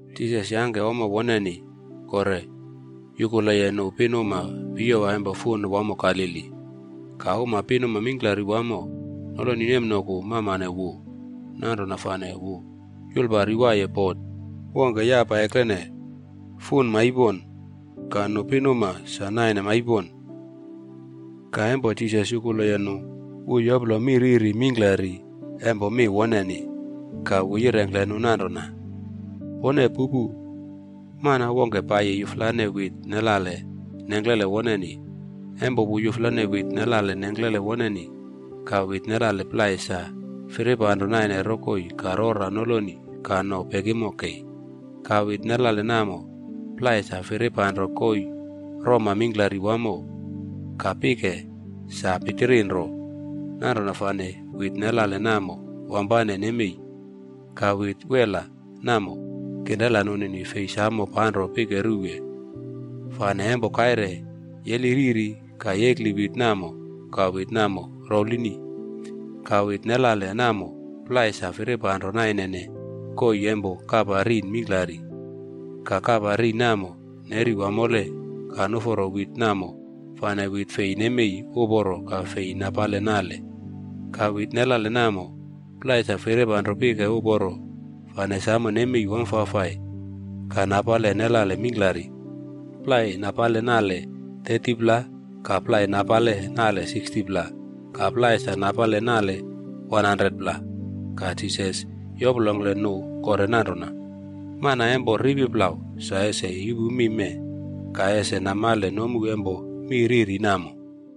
Jisas yangke ommo woneni kore yukuleye nu pinuma piyowa empo fun wamo Galili. Ka uma pinuma mingklari wamo noloni nemnoku mamane wu. Nanrona fane wu yulpari waiye bota wongke yapa eklene fun maipon ka nu pinuma sa naine maipon. Ka empo Jisas yukuleye nu, wu yoplo mi riri mingklari empo mi woneni. Ka wu yirengkle nu nanrona, “Pone pupu! Mana wongke paiyi yuflane wit nelale nengklele woneni. Empo wu yuflane wit nelale nengklele woneni, ka wit nelale plai sa firipanro naine rokoi ka rora noloni ka no pekimo kei. Ka wit nelale namo plai sa firipanro koii roma mingklari wamo ka pike sa pitirinro. Nanrona fane wit nelale namo wampane nemei. Ka wit wela namo, kinrela nunini fei samo panro pike ruwe. Fane empo kaire yeli riri ka yekli wit namo ka wit namo rouwlini. Ka wit nelale namo plai sa firipanro nainene koii empo kapa rin mingklari. Ka kapa rin namo neri wamole ka nuforo wit namo fane wit fei nemei uporo ka fei napale nale. Ka wit nelale namo plai sa firipanro pike uporo fane samo nemei wamfafai ka napale nelale mingklari. Plai napale nale 30pla ka plai napale nale 60pla ka plai sa napale nale 100pla.” Ka Jisas yoplongkle nu kore nanrona, “Mana empo ripi plau sa ese yupu mi mee, ka ese namale nomu empo mi riri namo.”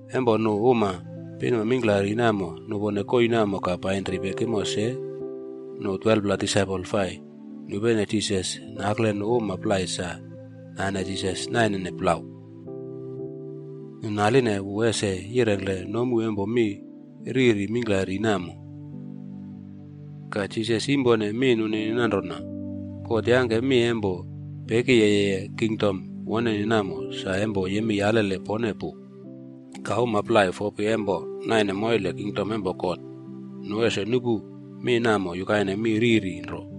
Empo nu uma pinuma mingklari namo nupone koii namo ka painri pekimo se, nu 12pla disaipol fai nupene Jisas nakle nu uma plai sa nane Jisas naine plau, nu naline wu ese yirengkle nomu empo mi riri mingklari namo. Ka Jisas yimpone mi nunini nanrona, “God yangke mi empo pekiyeye kingdom woneni namo sa empo yemei alele pone pu. Ka uma plai fopi empo naine moile kingdom empo God, nu ese nupu mi namo yukaine mi riri nro.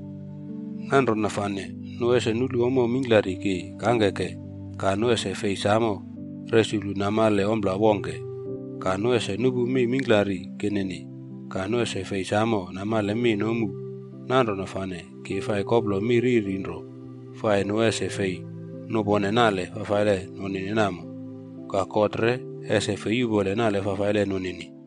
Nanrona fane ‘nu ese nulu ommo mingklari ki kangkeke, ka nu ese fei samo resuklu namale ompla wongke. Ka nu ese nupu mi mingklari kinini, ka nu ese fei samo namale mi nomu. Nanrona fane ki fai koplo mi riri nro fai nu ese fei nupone nale fafaile nunini namo, ka God re ese fei yupole nale fafaile nunini.’”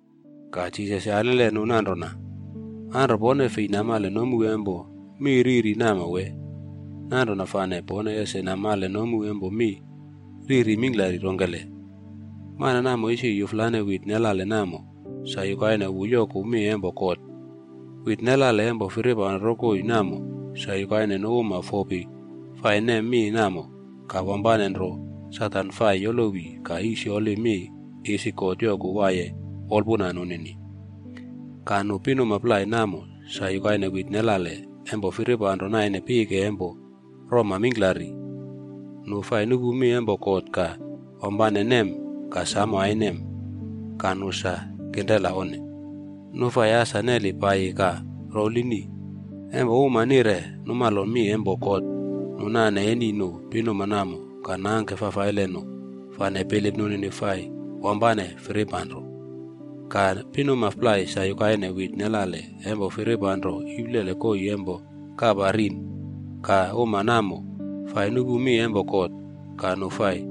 Ka Jisas yalile nu nanrona, “Anro pone fei namale nomu empo mi riri namo wee? Nanrona fane pone ese namale nomu empo mi riri mingklari rongkele? Mana namo isi yuflane wit nelale namo, sa yukaine wu yoku mi empo God. Wit nelale empo firipanro rokoi namo, sa yukaine nu uma fopi fai nem mi namo, ka wampane nro Satan fai yolowi ka yisyoli mi isi God yoku waiye wolpuna nunini. Ka nu pinuma plai namo sa yukaine wit nelale empo firipanro naine pike empo roma mingklari. Nu fai nupu mi empo God ka wampane nem ka samo ainem. Ka nu sa kinrela onne. Nu fai asa neli paiyi ka rouwlini. Empo uma nire numalo mi empo God nu nane eni nu pinuma namo ka nangke fafaile nu, fane bilip nunini fai wampane firipanro.” “Ka pinuma plai sa yukaine wit nelale empo firipanro iplele koii empo kapa rin. Nu uma namo fai nupu mi empo God, ka nu fai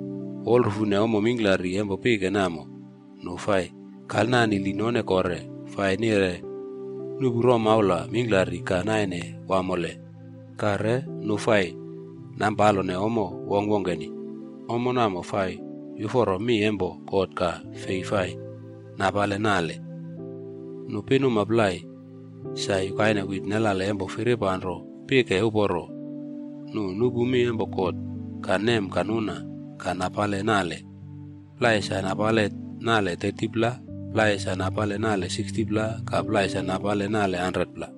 wolrufune ommo mingklari empo pike namo nu fai kalnanili none kore, fai nire nuꞌpu romaula mingklari ka naine wamole, ka re nu fai nampalone ommo wongkwongkeni. Ommo namo fai yuforo mi empo God ka fei fai napale nale. Nu pinuma plai sa yukaine wit nelale empo firipanro pike uporo. Nu nupu mi empo God, ka nem ka nuna ka napale nale. Plai sa napale nale 30pla, plai sa napale nale 60pla ka plai sa napale nale 100pla.”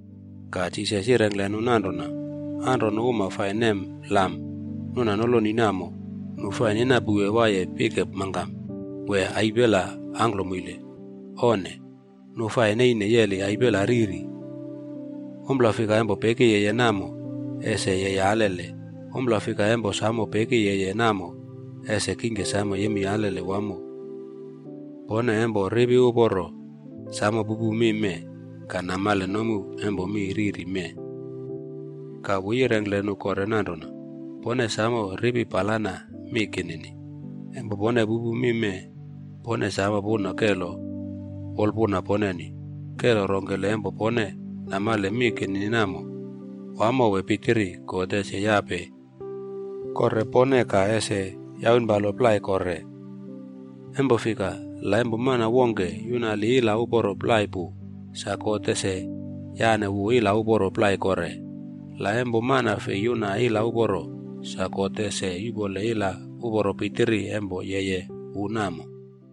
Ka Jisas yirengkle nu nanrona, “Anro nu uma fai nem lam nuna noloni namo nu fai ninapouwe waiye pike mangkam wee aipela angklomoile? Onne. Nu fai neine yeli aipela riri. Ompla fika empo peki yeye namo, ese yeye alele. Ompla fika empo samo peki yeye namo ese kingke samo yemei alele wamo. Pone empo ripi uporo, samo pupu mi mee ka namale nomu empo mi riri mee.” Ka wu yirengkle nu kore nanrona, “Pone samo ripi palana mi kinini. Empo pone pupu mi mee, pone samo puna kelo wolpuna poneni. Kelo rongkele empo pone namale mi kinini namo, wamo wee pitiri, God ese yape kore pone ka ese yaunpalo plai kore. Empo fika, la empo mana wongke yunali ila uporo plai pu, sa God ese yane wu ila uporo plai kore. La empo mana fei yuna ila uporo, sa God ese yuꞌpole ila uporo pitiri empo yeye wu namo.”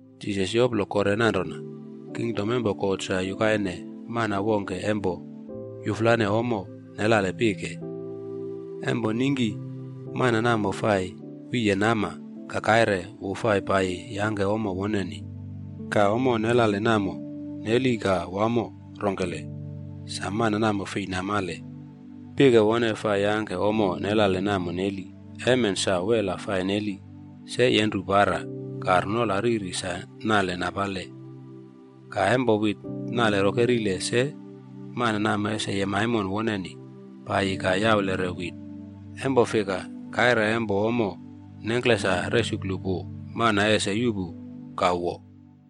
Jisas yoplo kore nanrona, “Kingdom empo God sa yukaine mana wongke empo yuflane ommo nelale pike. Empo ningki mana namo fai wiye nama, ka kaire wu fai paiyi yangke ommo woneni. Ka ommo nelale namo neli ka wamo rongkele, sa mana namo fei namale. Pike wone fai yangke ommo nelale namo neli. Emen sa, wela fai neli, se yenru para, ka runola riri sa nale napale. Ka empo wit nale rokerile se, mana namo ese yem aimon woneni paiyi ka yaulere wit. Empo fika, kaire empo ommo nengkle sa resuklu pu mana ese yuꞌpu ka wo.”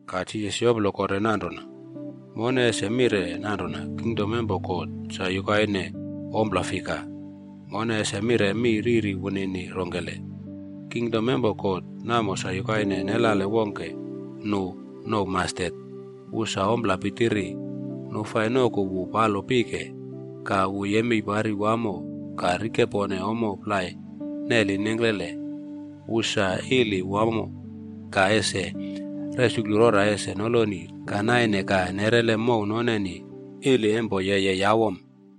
Ka Jisas yoplo kore nanrona, “Mone ese mire nanrona kingdom empo God sa yukaine ompla fika? Mone ese mire mi riri wunini rongkele? Kingdom empo God namo sa yukaine nelale wongke nu nouw ‘mastet’. Wu sa ompla pitiri. Nu fai noku wu palo pike, ka wu yemei pari wamo ka rikepone ommo plai neli nengklele. Wu sa ili wamo ka ese resuklu rora ese noloni ka naine ka nerele mow noneni ili empo yeye yawom.”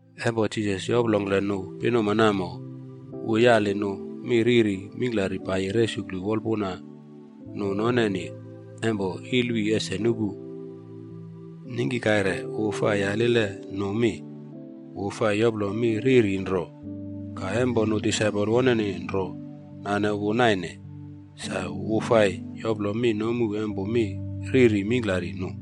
Empo Jisas yoplongkle nu pinuma namo, wu yali nu mi riri mingklari paiyi resuklu wolpuna nu noneni empo ilwi ese nupu. Ningki kaire wu fai yaliye nu mi, wu fai yoplo mi riri nro. Ka empo nu disaipol woneni nro nane wu naine, sa wu fai yoplo mi nomu empo mi riri mingklari nu.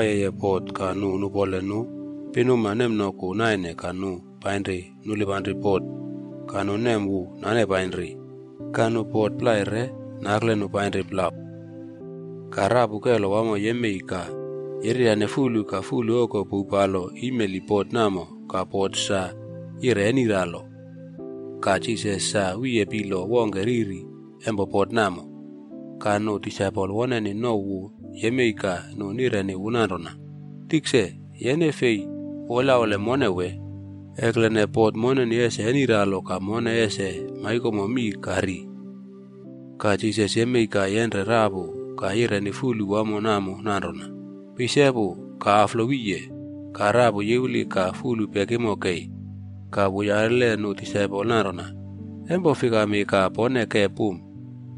Jisas sa nawaiyeye bot ka nu nupole nu pinuma nemnoku naine ka nu painri nulipanri bot ka nu nem wu nane painri. Ka nu bot plai re nakle nu painri plau. Ka rapu kelo wamo yemei ka yereryane fulu ka fulu oko pouwpalo imeli bot namo ka bot sa yire eniralo. Ka Jisas sa wiye pilo wongke riri empo bot namo. Ka nu disaipol woneni nouw wu yemei ka nu nireni wu nanrona, “Tikse, yene fei wolyaule mone wee? Eklene bot moneni ese eniralo ka mone ese maikomo mii ka ri.” Ka Jisas yemei ka yenre rapu ka yireni fulu wamo namo nanrona, “Peisepu ka aflo wiye!” Ka rapu yiwli ka fulu pekimo kei. Ka wu yalile nu disaipol nanrona, “Empo fikami ka pone ke pum?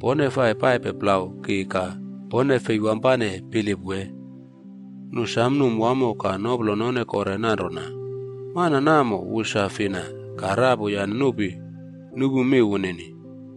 Pone fai paipe plau ki ka pone fei wampane bilip wee?” Nu sam num wamo ka noplo none kore nanrona, “Mana namo wu sa fina, ka rapu yane nupi nupu mi wunini?”